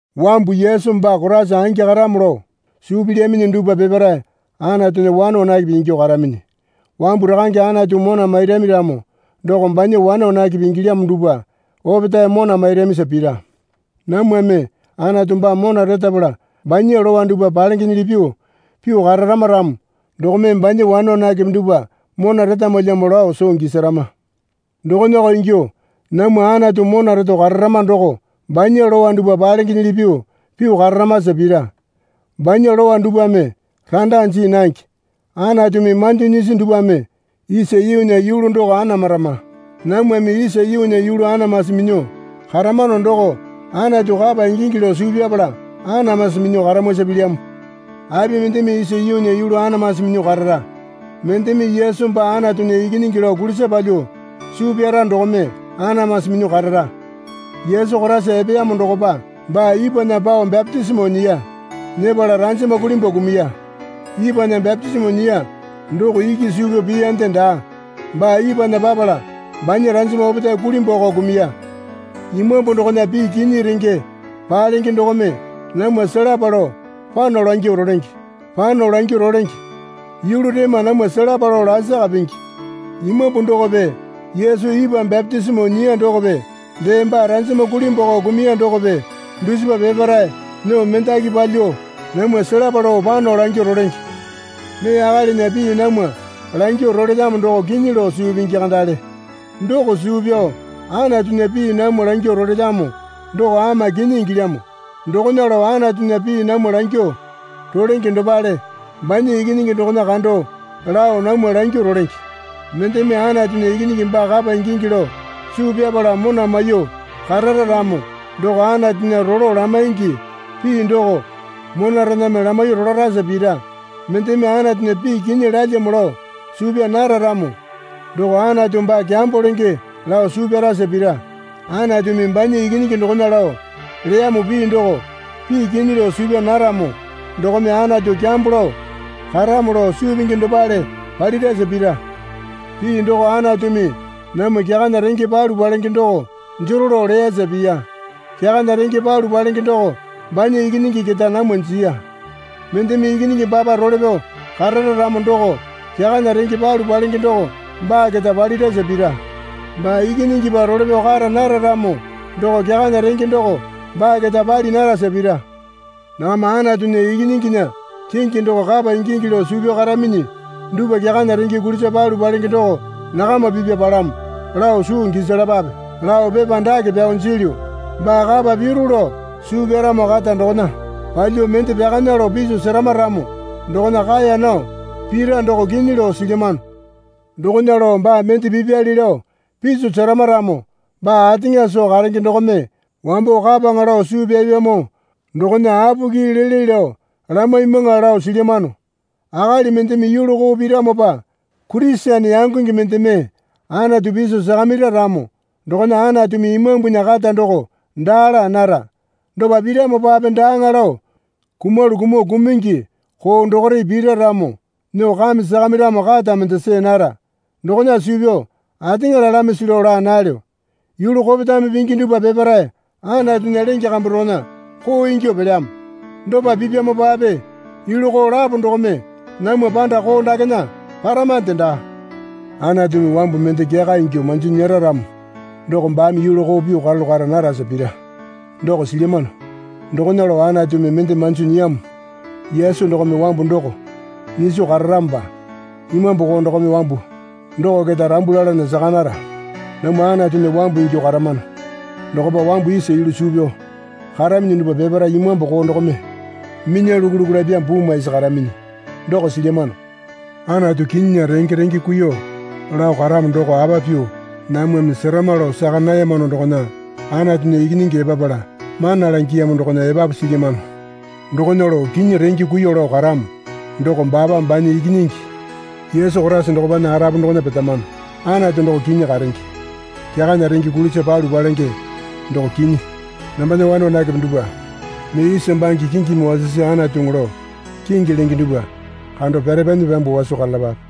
Wambu Yesu baa Koraisa angi karamo lao suu pilyaminyi dupwa peparae Anatunya wane wanakepe ingyuo karaminyi. Wambu Rakange Anatu mona mairami ramo doko banya wane wanakepe ingilyamo dupwa opetae mona mairamisa pira. Namwame Anatu baa mona retapala banya lowa dupwa palengenyili pyuo pyuo kararama ramo dokome banya wane wanakepe dupwa mona retamwalyamo lao soo gisarama. Dokonako ingyuo namwa Anatu mona reto kararama doko banya lowa dupwa palengenyili pyuo pyuo kararamasa pira. Banya lowa dupwame randa jii nange. Anatumi manjo nyisi dupwame isa yuunya yulu doko anamarama. Namwame isa yuunya yulu anamasi minyuo karamano doko Anatu kapa ingingi lao suu pyapala anamasi minyuo karamwasa pilyamo. Api mendeme isa yuunya yulu anamasi minyuo karara? Mendeme Yesu baa Anatunya Ikinyingi lao kulisa palyuo suu pyara dokome anamasi minyuo karara. Yesu Koraisa epeyamo dokopa baa ipwana pao bapitisimo nyiya. Nyepala ranjama kulimbwako kumuya. Ipwana bapitisimo nyiya doko iki suu pyao piyande daa. Baa ipwana papala banya ranjama opetae kulimbwako kumuya. Imambu dokona pii kinyi renge palenge dokome namwa selapa lao pano langyuo rolenge. Pano langyuo rolenge yulu rema namwa selapa lao lasaka pingi. Imambu dokope Yesu ipwa bapitisimo nyiya dokope dee baa ranjama kulimbwako kumuya dokope dusipa peparae nyuo mendaki palyuo namwa selapa lao pano langyuo rolenge. Mee akalinya pii namwa langyuo rolelyamo doko kinyi lao suu pingi kandale. Doko suu pyao Anatunya pii namwa langyuo rolelyamo doko ama kinyi ingilyamo. Dokona lao Anatunya pii namwa langyuo rolenge dopale banya Ikinyingi dokona kando lao namwa langyuo rolenge. Mendeme Anatunya Ikinyingi baa kapa ingingi lao suu pyapala mona maiyuo karara ramo doko Anatunya rolo lamaingi pii doko monarename lamaiyuo rolarasa pira. Mendeme Anatunya pii kinyi lalyamo lao suu pyaa nara ramo doko Anatu baa kyambo lenge lao suu pyarasa pira. Anatumi banya Ikinyingi dokona lao leyamo pii doko pii kinyi lao suu pyaa naramo dokome Anatu kyambo lao karamo lao suu pingi dopale palirasa pira. Pii doko Anatumi namwa kyakana renge palu palenge doko jero lao leyasa piya. Kyakana renge palu palenge doko banya Ikinyingi keta namwa jiya. Mendeme Ikinyingi baapa role pyao karara ramo doko kyakana renge palu palenge doko baa keta palirasa pira. Baa Ikinyingipa role pyao kara nara ramo doko kyakana renge doko baa keta pali narasa pira. Nakama Anatunya Ikinyinginya kingi doko kapa ingingi lao suu pyao karaminyi dupwa kyakana renge kulisa palu palenge doko nakama pipwa palamo lao soo gisalapape lao pepa dake pyao jilyu. Baa kapa piru lao suu pyaramo kata dokona palyuo mende pyakana lao piso serama ramo dokona kaeya nao pira doko kinyi lao silyamano. Dokona lao baa mende pipyali lao piso serama ramo baa ateŋa soo karenge dokome wambo kapaŋa lao suu pyapyamo dokona apoki lele lao lamaimwaŋa lao silyamano. Akali mendeme yulu koo piramopa Kurisene yangonge mendeme Anatu piso sakamira ramo dokona Anatumi imambunya kata doko daa laa nara. Dopa piramopape daaŋa lao kumalu kumuo kumungi koo dokore pira ramo nyuo kame sakamiramo kata mende see nara. Dokona suu pyao ateŋa lalamisi lao laa nalyo. Yulu kopetame pingi dupwa peparae Anatunya lenge kambu dokona koo ingyuo pelyamo. Dopa pipyamopape yulu koo lapo dokome namwa panda koo dakena paramande daa. Anatumi wambu mende kyaka ingyuo manjo nyera ramo doko baame yulu koo pyuo karalu kara narasa pira doko silyamano. Dokona lao Anatumi mende manjo nyiyamo Yesu dokome wambu doko nyiso kararamopa imambu koo dokome wambu doko keta rambu lalana saka nara. Namwa Anatunya wambu ingyuo karamano. Dokopa wambu isa yulu suu pyao karaminyi dupwa peparae imambu koo dokome minya luku luku lapyamo puu maisi karaminyi doko silyamano. Anatu kinyinya renge renge kuiyuo lao karamo doko apa pyuo namwame serama lao saka nayamano dokona Anatunya Ikinyingi epapala mana langiyamo dokona epapu silyamano. Dokona lao kinyi renge kuiyuo lao karamo doko baapa banya Ikinyingi Yesu Koraisa dokopana arapu dokona petamano. Anatu doko kinyi karenge. Kyakana renge kulisa palu palenge doko kinyi. Nambana wane wanakepe dupwa, mee isa bange kingimi wasisi anatuŋu lao kingi lenge dupwa kando pyarepanyi pyambuo waso karalapape.